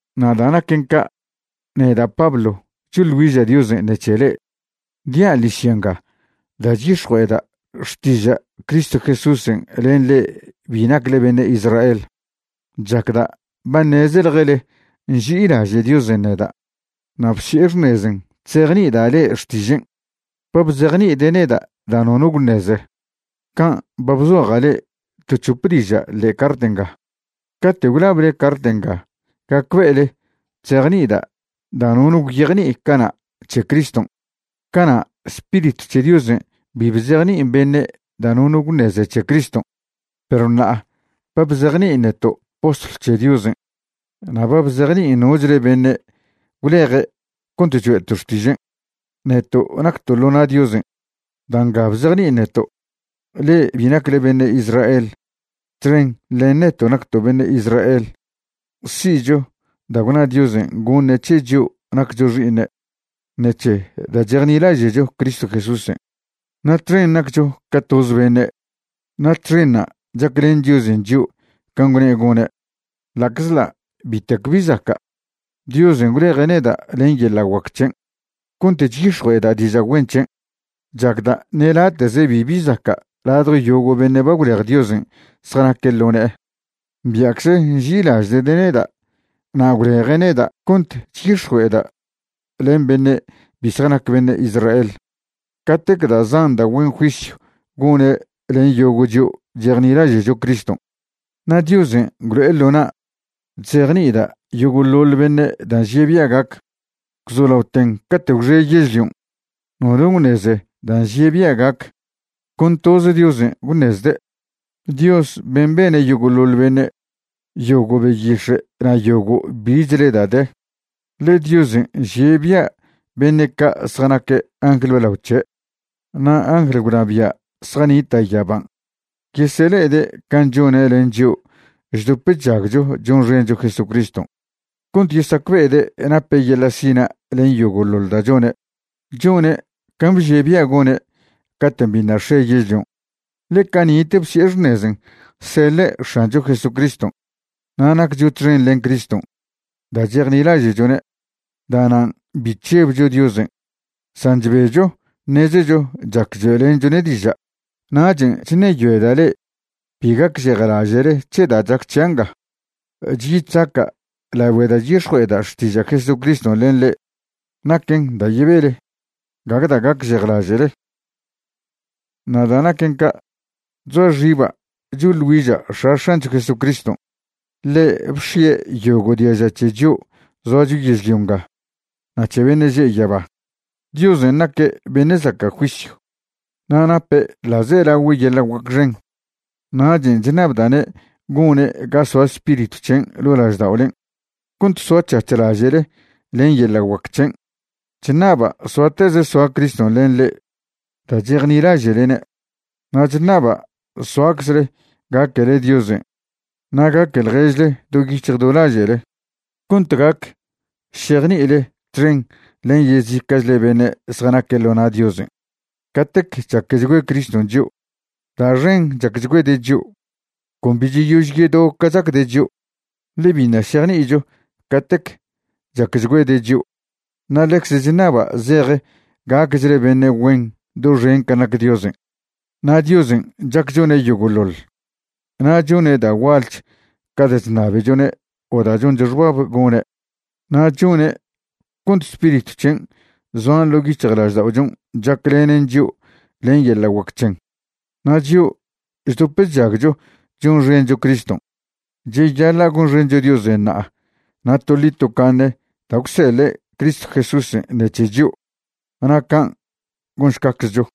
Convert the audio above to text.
Na' da' naquen ca', neda' Pablo choḻ güiža' Diosen' ṉec̱he le'e. Dia' ḻižya nga da' chyix̱jue'eda' xtiža' Cristo Jesúsen' len le'e bi nacle beṉe' Israel. Chacda' ba ṉezeḻjele nži'ilaže' Diosen' neda' na' bsi'e xṉezen' chzejni'ida' le'e xtižen'. Ba bzejni'ide' neda' da' nono gwṉeze, can' ba bzoja' le'e to c̱hope diža' ḻe'e cart nga. Cate' gwlable cart nga gacbe'ele chejni'ida' da' nono gwyejni'i cana' c̱he Criston'. Cana' Spiritw c̱he Diosen' bi bzejni'in beṉe' da' nono gwṉeze c̱he Criston', perw ṉa'a ba bzejni'in neto' postlw c̱he Diosen', na' ba bzejni'in nochle neto' gwleje' cont choe'to' xtižen', neto' nacto' ḻo na' Diosen'. Da' nga bzejni'in neto', le'e bi nacle beṉe' Israel txen len neto' nacto' beṉe' Israel si'cho da' gwna Diosen' goṉe' c̱he chio' naccho xi'iṉe' ṉec̱he da' chejnilaže'cho Cristo Jesúsen', na' txen naccho ca toze beṉe', na' txenṉa' chaclen Diosen' chio' can' gwne' gone'. Ḻa'czḻa' bitec bi zaca', Diosen' gwleje' neda' len yeḻa' guac c̱hen' cont chyix̱jue'eda' diža' güen c̱hen'. Chacda' ṉe late'ze bibi zaca' ladjo yogo' beṉe' ba gwlej Diosen' zjanaque' ḻo ne'e. Bia'cze nži'ilaže'de' neda' na' gwleje' neda' cont chyix̱jue'eda' len beṉe' bi zjanac beṉe' Israel catec da' zan da' güen juisyw gone' len yogo' chio' chejnilaže'cho Criston'. Na' Diosen' gwlo'e ḻo na' chzejni'ida' yogo'ḻoḻ beṉe' da' nžie' bia' gac. Gwzolaoten cate' gwxe yežlion', nono gwṉeze da' nžie' bia' gac, con toz Diosen' gwṉezde', Dios ben' bene' yogo'ḻoḻ beṉe', yogo' beyix̱e' na' yogo' bichle da' de. Ḻe Diosen' nžie' bia' beṉe' ca' zjanac angl blao c̱he' na' angl gwnabia' zjanita' yaban' yesele'ede' can' chone' len chio' chdop chžagcho chonxencho Jesucriston', cont yesacbe'ede' nape' yeḻa' sina' len yogo'ḻoḻ da' chone'. Chone' can' bžie' bia' gone' caten' biṉa' x̱e yežlion', ḻe cani'te bsi'e xṉezen' seḻe' X̱ancho Jesucriston'. Na' naccho txen len Criston' da' chejnilaže'chone'. Da'nan' bi chžebcho Diosen', san chbecho ṉezecho chac choe'lenchwne' diža'. Nachen' chṉeyoeda' le'e bi gacžejlaže'le c̱he da' chac c̱hia' nga chyi chzaca' lagüe da' chyix̱jue'eda' xtiža' Jesucriston' len le'e. Naquen da' yebele, gague da' gacžejlaže'le. Na' da' naquen ca', chzoa xiba' choḻ güiža' X̱a X̱ancho Jesucriston'. Ḻe' bx̱ie' yogo' diaža c̱he chio' zoacho yežlio nga na' c̱he beṉe' že' yaba. Diosen' naque' beṉe' zaca' juisyw na' nape' ḻa'zelagüe' yeḻa' guac xen. Nachen' chṉabda'ne' gone' ga soa Spiritw c̱hen' ḻo' lažda'olen' cont soa c̱hac̱h laže'le len yeḻa' guac c̱hen. Chṉaba' soateze soa Criston' len le'e da' chejnilaže'lene'. Na' chṉaba' soaczle gaquele Diosen' na' gaque ḻježle do yic̱hj do laže'le, cont gac šejni'ile txen len yezica'chle beṉe' zjanaque' ḻo na' Diosen' catec chaquechgüe Criston' chio'. Da' xen chaquechgüede' chio', con bi cheyož yedo ca chacde' chio'. Ḻe biṉa' šejni'icho catec chaquechgüede' chio'. Na' ḻecze chṉaba' zej gacchle beṉe' güen doxen can' nac Diosen'. Na' Diosen' chac chone' yogo'ḻoḻ, na' chone' da' gualch ca da' chṉabechone' o da' choncho xbab gone'. Na' chone' cont Spiritw c̱hen' zoan ḻo' yic̱hjlažda'ochon' chaclenen chio' len yeḻa' guac c̱hen'. Na' chio' chdop chžagcho chonxencho Criston', cheyaḻa' gonxencho Diosen' ṉa'a na' toḻi tocaṉe da' gwseḻe' Cristo Jesúsen' ṉec̱he chio'. Na' can' gonšcaczcho.